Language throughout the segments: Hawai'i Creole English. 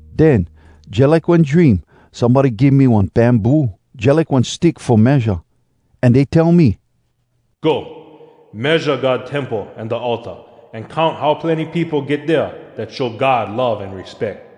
Den, jalike one dream, somebody give me one bamboo, jalike one stick fo measure. An dey tell me, “Go. Measure God temple an da altar, an count how plenny peopo get dea dat show God love an respeck.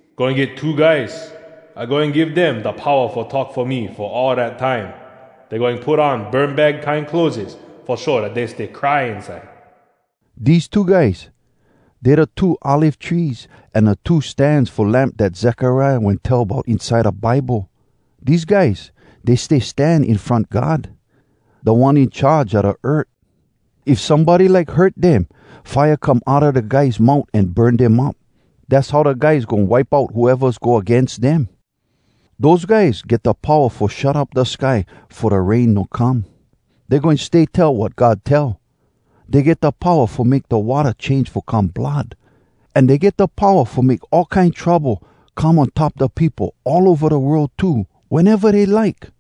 “Goin get two guys. I goin give dem da powa fo talk fo me fo all dat time. Dey goin put on burmbag kine clotheses fo show dat dey stay cry inside.” Dese two guys, dey da two olive trees an da two stans fo lamp dat Zekariah wen tell bout inside da Bible. Dese guys, dey stay stan in front God, Da One In Charge a da earth. If somebody like hurt dem, fire come outa da guys mout an burn dem up. Dass how da guys goin wipe out whoevas go agains dem. Dose guys get da powa fo shut up da sky fo da rain no come. Dey goin stay tell wat God tell. Dey get da powa fo make da watta change fo come blood. An dey get da powa fo make all kine trouble come on top da peopo all ova da world too, weneva dey like.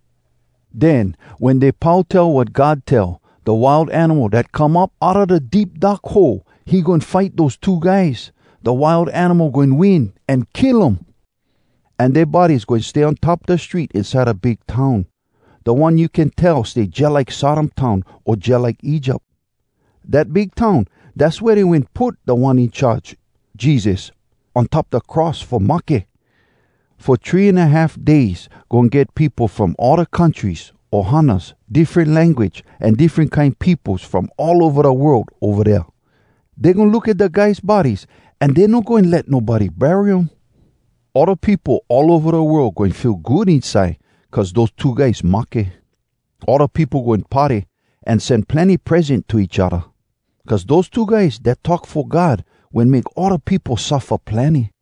Den, wen dey pau tell wat God tell, da Wild Animal dat come up outa da Deep Dark Hole, he goin fight dose two guys. Da Wild Animal goin win, an kill um. An dea bodies goin stay on top da street inside da Big Town, da one you can tell stay jalike Sodom town o jalike Egypt. Dat Big Town, dass wea dey wen put Da One In Charge, Jesus, on top da cross fo mahke. Fo three an a half days goin get peopo from all da countries, ohanas, diffren language, an diffren kine peopos from all ova da world ova dea. Dey goin look at da guys bodies, an dey no goin let nobody bury um. All da peopo all ova da world goin feel good inside cuz dose two guys mahke. All da peopo goin party, an sen plenny present to each odda. Cuz dose two guys dat talk fo God wen make all da peopo suffa plenny.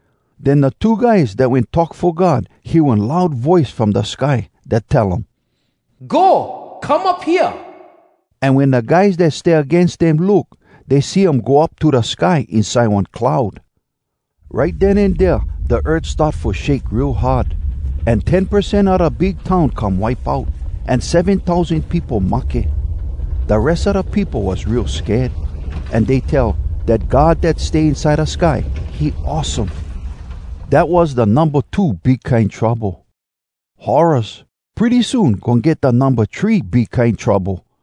Den da two guys dat wen talk fo God hear one loud voice from da sky dat tell um, “Go come up hea!” An wen da guys dat stay agains dem look, dey see um go up to da sky inside one cloud. Right den an dea da earth start fo shake real hard. An ten percent a da Big Town come wipe out, an seven tousan peopo mahke. Da res a da peopo was real sked, an dey tell dat God dat stay inside da sky, he awesome. Dat was da numba two big kine trouble. Horraz! Pretty soon goin get da numba three big kine trouble!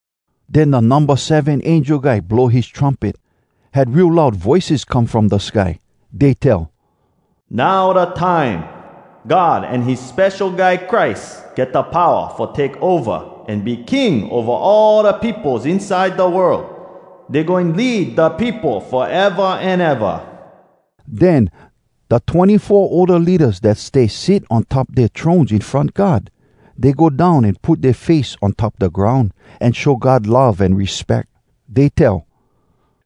Den da numba seven angel guy blow his trumpet. Had real loud voices come from da sky. Dey tell, “Now da time! God an his Spesho Guy Christ get da powa Fo take ova an be King ova all da peopos inside da world. Dey goin lead da peopo foeva an eva!” Den da twenny-four older leadas dat stay sit on top dea thrones in front God, dey go down an put dea face on top da groun, an show God love an respeck. Dey tell,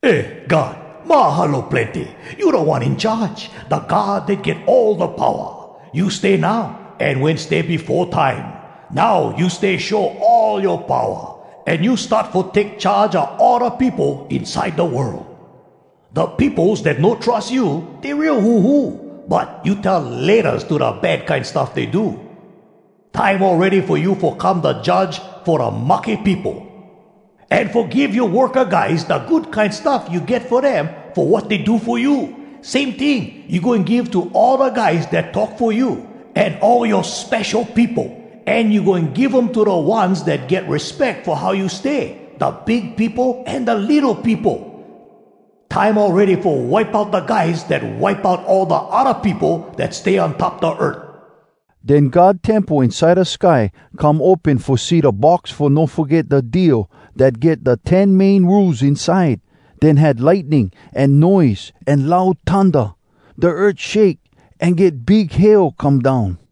“Eh, God! Mahalo plenny! You Da One In Charge, Da God Dat Get All Da Powa! You stay now, An wen stay befo time! Now you stay show all yoa powa, An you start fo take charge a all da peopo inside da world! Da peopos dat no trus you, Dey real huhu, But you tell ‘Laytas’ to da bad kine stuff dey do. “Time awready fo you Fo come da Judge fo da mahke peopo. An fo give yoa worka guys da good kine stuff you get fo dem Fo wat dey do fo you. Same ting you goin give to all da guys dat talk fo you, An all yoa spesho peopo, An you goin give um to da ones dat get respeck fo how you stay, Da big peopo an da litto peopo. “Time awready fo wipe out da guys Dat wipe out all da odda peopo Dat stay on top da earth!” Den God temple inside da sky come open fo see da Box Fo No Foget Da Deal dat get da Ten Main Rules inside. Den had lightning, an noise, an loud thunda. Da earth shake, an get big hail come down.